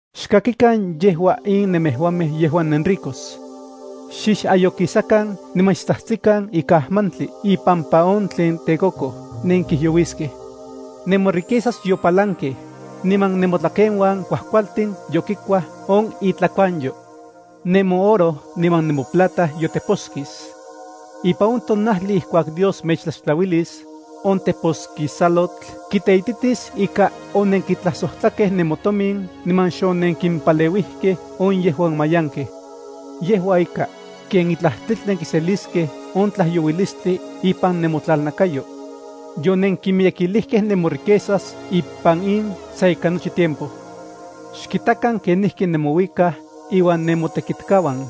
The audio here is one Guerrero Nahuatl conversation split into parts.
¡Xkakikan yejua in nemejuamej yejuan nenricos! Xixayokisakan niman xtsajtsikan ikan ajmantli ipampa on tlen tekokoj nenkijyouiskej. Nemoriquezas yopalankej, niman nemotlakeuan kuajkualtin yokikuaj on itlakuanyo. Nemooro niman nemoplata yoteposkis. Ipan on tonajli ijkuak Dios mechtlaxtlauilis, on teposkisalotl kiteititis ika onenkitlajsojtlakej nemotomin niman xonenkimpaleuijkej on yejuan mayankej. Yejua ika, ken itlaj tlitl nenkiseliskej on tlajyouilistli ipan nemotlalnakayo. Yonenkimiyekilijkej nemoriquezas ipan in sa ika nochi tiempo. ¡Xkitakan kenijki nemouikaj inuan nemotekitkauan!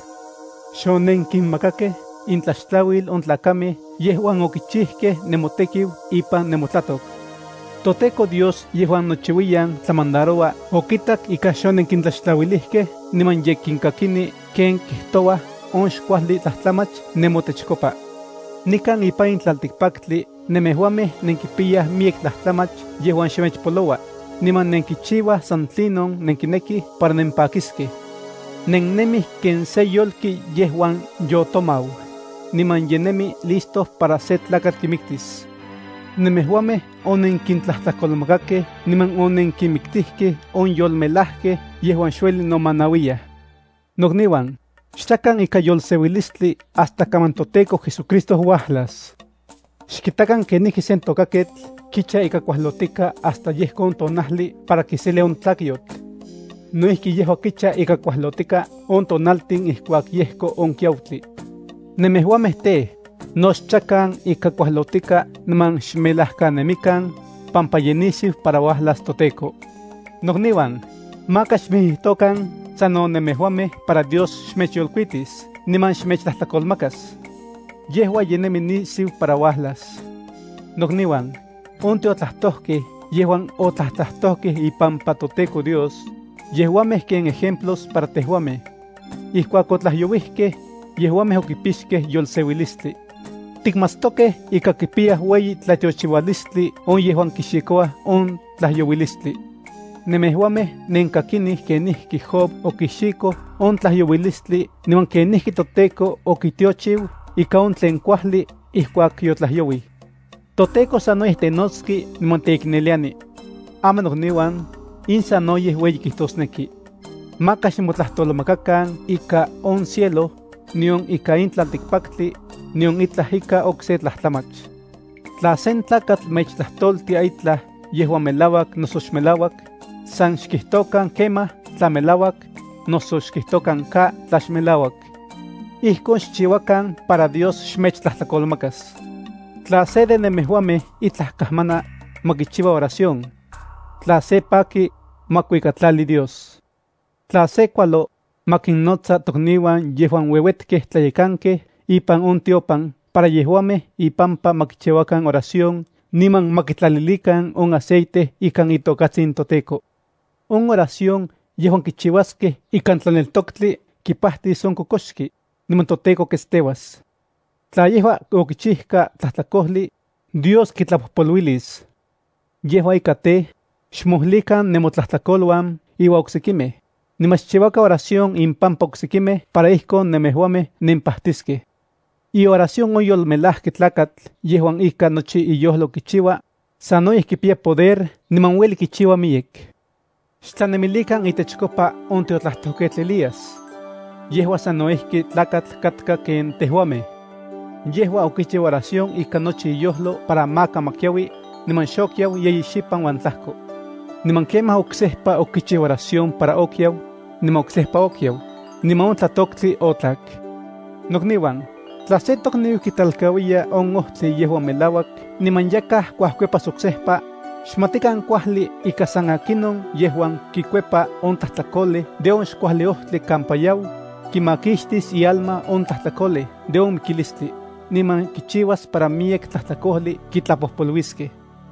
Xonenkinmakakej intlaxtlauil on tlakamej yejuan okichijkej nemotekiu ipan nemotlatok. ToTEKO Dios yejuan nochiuiyan tlamandaroua okitak ika xonenkintlaxtlauilijkej niman ye kinkakini ken kijtouaj on xkuajli tlajtlamach nemotechkopa. Nikan ipan in tlaltikpaktli nemejuamej nenkipiyaj miyek tlajtlamach yejuan xmechpoloua, niman nenkichiuaj san tlinon nenkinekij para nempakiskej. Nennemij ken sen yolki yejuan yotomau, niman ye nemi listo para sen tlakatl kimiktis. Nemejuamej onenkintlajtlakolmakakej niman onenkinmiktijkej on yolmelajkej yejuan xuelij nomanauiyaj. Nokniuan, xchakan ikan yolseuilistli hasta kaman toTEKO JesuCristo uajlas. Xkitakan kenijki sen tokaketl kicha ika kuajlotika hasta yejko on tonajli para kiselia on tlakyotl. No ijki yejua kicha ika kuajlotika on tonaltin ijkuak yejko on kiautli. Nemejuamej tej, no xchakan ika kualotika niman xmelajkanemikan, pampa ye nisiu para uajlas toTEKO. Nokniuan, maka xmijijtokan sano nemejuamej para Dios xmechyolkuitis niman xmechtlajtlakolmakas. Yejua ye nemi nisiu para uajlas. Nokniuan, on tiotlajtojkej yejuan otlajtlajtojkej ipampa toTEKO Dios, yejuamej ken ejemplos para tejuamej. Ijkuak otlajyouijkej, yejuamej okipixkej yolseuilistli. Tikmatstokej ika kipiyaj ueyi tlatiochiualistli on yejuan kixikouaj on tlajyouilistli. Nemejuamej nenkakinij kenijki Job okixikoj on tlajyouilistli niman kenijki toTEKO okitiochiu ika on tlen kuajli ijkuak yotlajyouij. ToTEKO sanoyej tenotski niman teikneliani. Aman nokniuan, in sanoyej ueyi kijtosneki. Maka xmotlajtolmakakan ika on cielo, nion ika in tlaltikpaktli, nion itlaj ika okse tlajtlamach. Tla sen tlakatl mechtlajtoltia itlaj yejuan melauak noso xmelauak, san xkijtokan “Kemaj”, tla melauak, noso xkijtokan “Ka”, tla xmelauak. Ijkon xchiuakan para Dios xmechtlajtlakolmakas. Tla se de nemejuamej itlaj kajmana, ma kichiua oración. Tla se paki, ma kuikatlali Dios. Tla se kualo, ma kinnotsa tokniuan yejuan ueuetkej tlayekankej ipan on tiopan para yejuamej ipampa ma kichiuakan oración niman ma kitlalilikan on aceite ikan itokatsin toTEKO. On oración yejuan kichiuaskej ikan tlaneltoktli kipajtis on kokoxki, niman toTEKO ketsteuas. Tla yejua okichijka tlajtlakojli, Dios kitlapojpoluilis. Yejua ika tej, xmojlikan nemotlajtlakoluan iuan oksekimej, niman xchiuakan oración impampa oksekimej para ijkon nemejuamej nempajtiskej. Ioración on yolmelajki tlakatl yejuan ikan nochi iyojlo kichiua, sanoyej kipiya poder niman ueli kichiua miyek. Xtlanemilikan itechkopa on tiotlajtojketl Elías. Yejua sano ijki tlakatl katka ken tejuamej. Yejua okichiu oración ikan nochi iyojlo para maka ma kiaui, niman xokiau yeyi xipan uan tlajko. Niman kemaj oksejpa okichiu oración para okiau, niman oksejpa okiau, niman on tlatoktli otlak. Nokniuan, tla sen tokniu kitlalkauiya on ojtli yejuan melauak niman yakaj kuajkuepas oksejpa, xmatikan kuajli ika san akinon yejuan kikuepa on tlajtlakolej de on xkuajli ojtli kampa yau, kimakixtis ialma on tlajtlakolej de on mikilistli, niman kichiuas para miyek tlajtlakojli kitlapojpoluiskej.